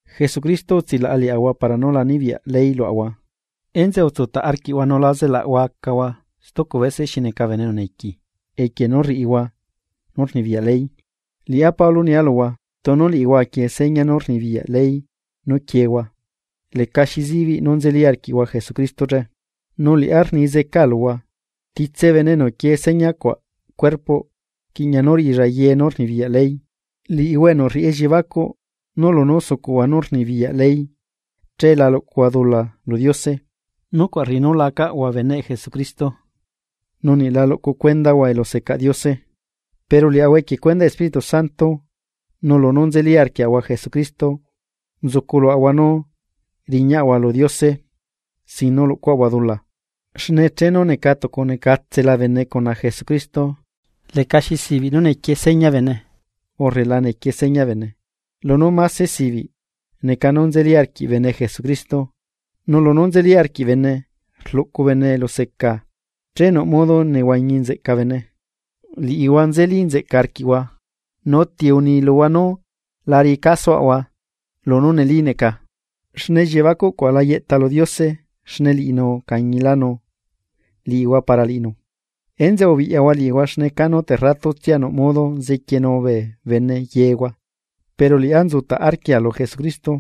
Jesucristo utsilaꞌa liaꞌahua para nú la nibiyaꞌ ley luaꞌahua enzeꞌe utsutaꞌ arquiꞌhua nu la zelaꞌhua acahua stucu bese xi neca esclavo equie nú rriꞌihua nú rnibiyaꞌ ley. Liꞌá Pablo nia luhua: Tunu liꞌihua aquie seña nú rnibiyaꞌ ley nú quiehua lecaxi zibiꞌ nú nzeli arquiꞌhua Jesucristo che. Nu liꞌá rni zeca luhua: Titse bene enu quie señacuaꞌ cuerpoꞌ rquiꞌña nú riꞌilla ye nú rnibiyaꞌ ley. Liꞌihua enu rriꞌi elliebacuꞌ nú lunú sucuꞌhua nú rnibiyaꞌ ley che la luꞌcuhua dula lu Diose. Nucuaꞌ rriꞌi nú lacaꞌhua beneꞌ Jesucristo nu niꞌ la luꞌcu cuendaꞌhua elusecaꞌ Diose. Pero liaꞌahua equie cuendaꞌ Espíritu Santo, nu lunú nzeli arquiaꞌahua Jesucristo nzucu luaꞌahua nú riñaꞌahua lu Diose sin nú luꞌcuaꞌahua dula. Xne chenu neca tucunecatsela bene cuna Jesucristo lecaxi sibiꞌ nú nequie seña bene urre la nequie seña bene. Lunú mase sibiꞌ neca nú nzeli arquiꞌ bene Jesucristo nu lunú nzeli arquiꞌ bene rlucu bene eluseca, che nuꞌ modo nehuañi nzeꞌca bene. Liꞌihua nzeli nzeꞌca arquiꞌhua. ¿Nu ti uni luhua nú lá riꞌi casoaꞌhua lunú neli neca? Xne elliebacuꞌcuaꞌ la yeꞌta lu Diose xne liꞌinu ucañilanu liꞌihua para liꞌinu. Enzeꞌe ubiꞌyahua liꞌihua xne canu terratutsia nuꞌ modo zequienu bee bene yehua. Pero liꞌá nzutaꞌ arquia lu Jesucristo,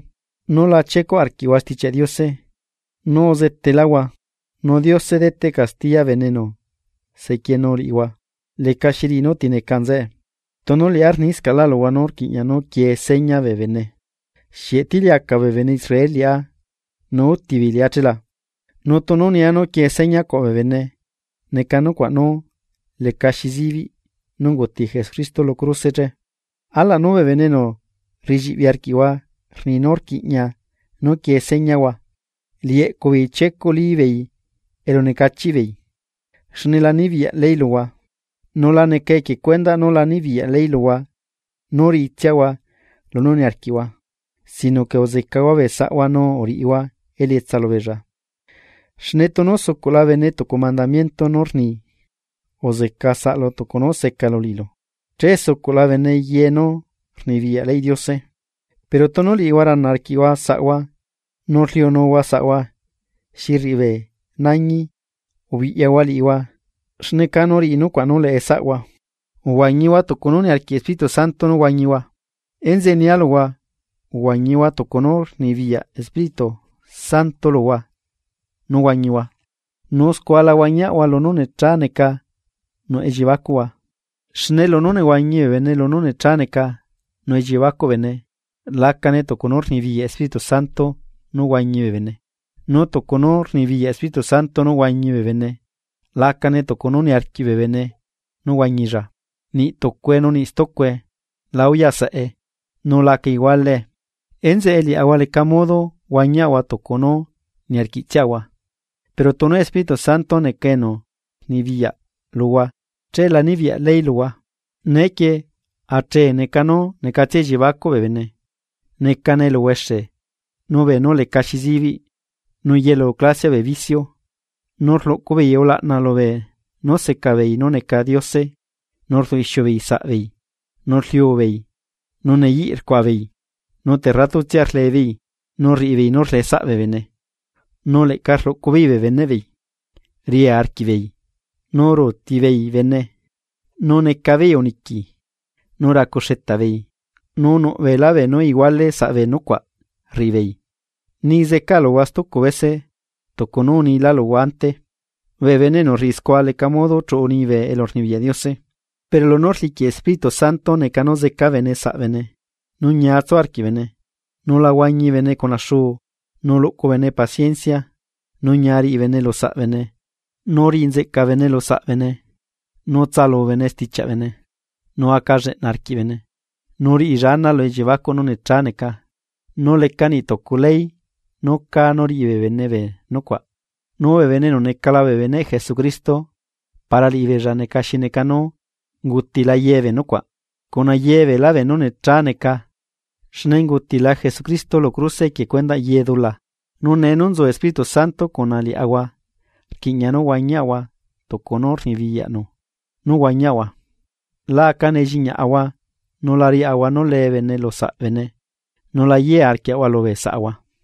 nú la chiecuꞌ arquiꞌhua Stichiaꞌ Diose nú uzetelahua. Nu Diose deteꞌ castiya bene enu sequienu liꞌihua lecaxi riꞌi nú ti neca nzeꞌe. Tunu liꞌá rniscaꞌlá luhua nú rquiꞌña nú quie seña bee bene, ¿xieꞌ tiliacaꞌ bee bene Israel liꞌá nu útibeei liꞌá chela? Nu tunu nia nú quie señacuaꞌ bee bene neca nucuaꞌ nú lecaxi zibiꞌ nú unguti Jesucristo lu cruse che. ¡Alaꞌ nú bee bene enu rriꞌilliꞌbi arquiꞌhua rni nú rquiꞌña nú quiee, señahua alaꞌ nú liꞌi eꞌcubeei chiecuꞌlí beei elunecachiꞌbeei! Xne la nibiyaꞌ ley luhua, nu la neca equie cuendaꞌ nú la nibiyaꞌ ley luhua nú riꞌitsiahua lunú niarquiꞌhua, sino que uzecahua bee saꞌhua nu uriꞌihua elietsa lubeella. Xne tunu sucuꞌla bene tucu mandamiento nú rni: “Uzeca saꞌlu tucu nú secalu liꞌilu”, che sucuꞌla bene yenú rnibiyaꞌ leyꞌ Diose. Pero tunu liꞌihua rana arquiꞌhua saꞌhua nu rliunuhua saꞌhua xi rriꞌi bee nañi ubiꞌyahua liꞌihua xne canu riꞌi nucuaꞌ nú leꞌesaꞌhua. Uhuañihua tucu nú niarquiꞌ Espíritu Santo nú huañihua. Enzeꞌe nia luhua, uhuañihua tucu nú rnibiyaꞌ Espíritu Santo luhua nú huañihua. Nu scua la huañiaꞌhua lunú necha neca nuꞌ elliebacuꞌhua. Xne lunú nehuañi bene lunú nechá neca nuꞌ elliebacuꞌ bene, lacane tucu nú rnibiyaꞌ Espíritu Santo nú huañi bee bene. Nu tucu nú rnibiyaꞌ Espíritu Santo nú huañi bee bene, lacane tucu nú niarquiꞌ bee bene nú huañilla. Niꞌ tucue nu niꞌ stucue la uyaꞌ saꞌe nu laca igualee, enzeꞌe liaꞌahua leca modo huañiaꞌahua tucu nú niarquiꞌtsiaꞌahua. Pero tunu Espíritu Santo neca enu rnibiyaꞌ luhua che la nibiyaꞌ ley luhua. Neequie achee neca nú necatsia elliebacuꞌ bee bene: Necane eluhuexe nu beenú lecaxi zibiꞌ, nu yelu clasiaꞌ bee biciu. Nu rluꞌcu beei ulaꞌna lubeenú seca beei nú neca diose nu rduꞌ ixiu beei saꞌbeei, nu rliubeei, nu neyiꞌ rcuaꞌa beei. Nu terratutsia rlebeei, nu rriꞌibeei nú rleꞌe saꞌ bee bene, nu leꞌca rluꞌcubeei bee beneꞌbeei, ria arquiꞌbeei, nu ruuti beei bene nu necabeei uniqui, nu racu xetaꞌ beei, nu nuꞌ beelá beenú iguale saꞌbee nucuaꞌ rriꞌibeei, ni zeca luhua stucu bese tucu nú unila luhua ante, bee bene enu rriꞌi scua leca modo chuꞌu liñibe elurnibiyaꞌ Diose. Pero lunú rliquiꞌ Espíritu Santo neca nú zeca bene saꞌbene, nú ñia tsu arquiꞌ bene, nu la huañi bene cuna xuu, nú luꞌcu bene paciencia, nú ñia riꞌi bene lusaꞌ bene nu riꞌi nzeꞌca bene lusaꞌ bene nu tsaꞌalu bene stichiaꞌbene, nu aca lleꞌna arquiꞌ bene, nu riꞌilla ana lu elliebacuꞌ nú necha neca, nu leca niꞌ tucu ley nú cá nú riꞌi bee bene bee nucuaꞌ. Nu bee bene enu necala bee beneꞌ Jesucristo para liꞌibeella neca xi neca nú ungutila yebee nucuaꞌ, cuna yebeelá beenú nechá neca xne ungutila Jesucristo lu cruse equie cuendaꞌ ye dula. Nu nee nú nzu Espíritu Santo cuna liaꞌahua rquiꞌña nú huañiaꞌahua tucu nú rnibiyaꞌnu nú huañiaꞌahua. La aca nelliñaꞌahua nu la riaꞌahua nú le bene lu saꞌ bene, nu la yea arquiaꞌahua lubee saꞌahua.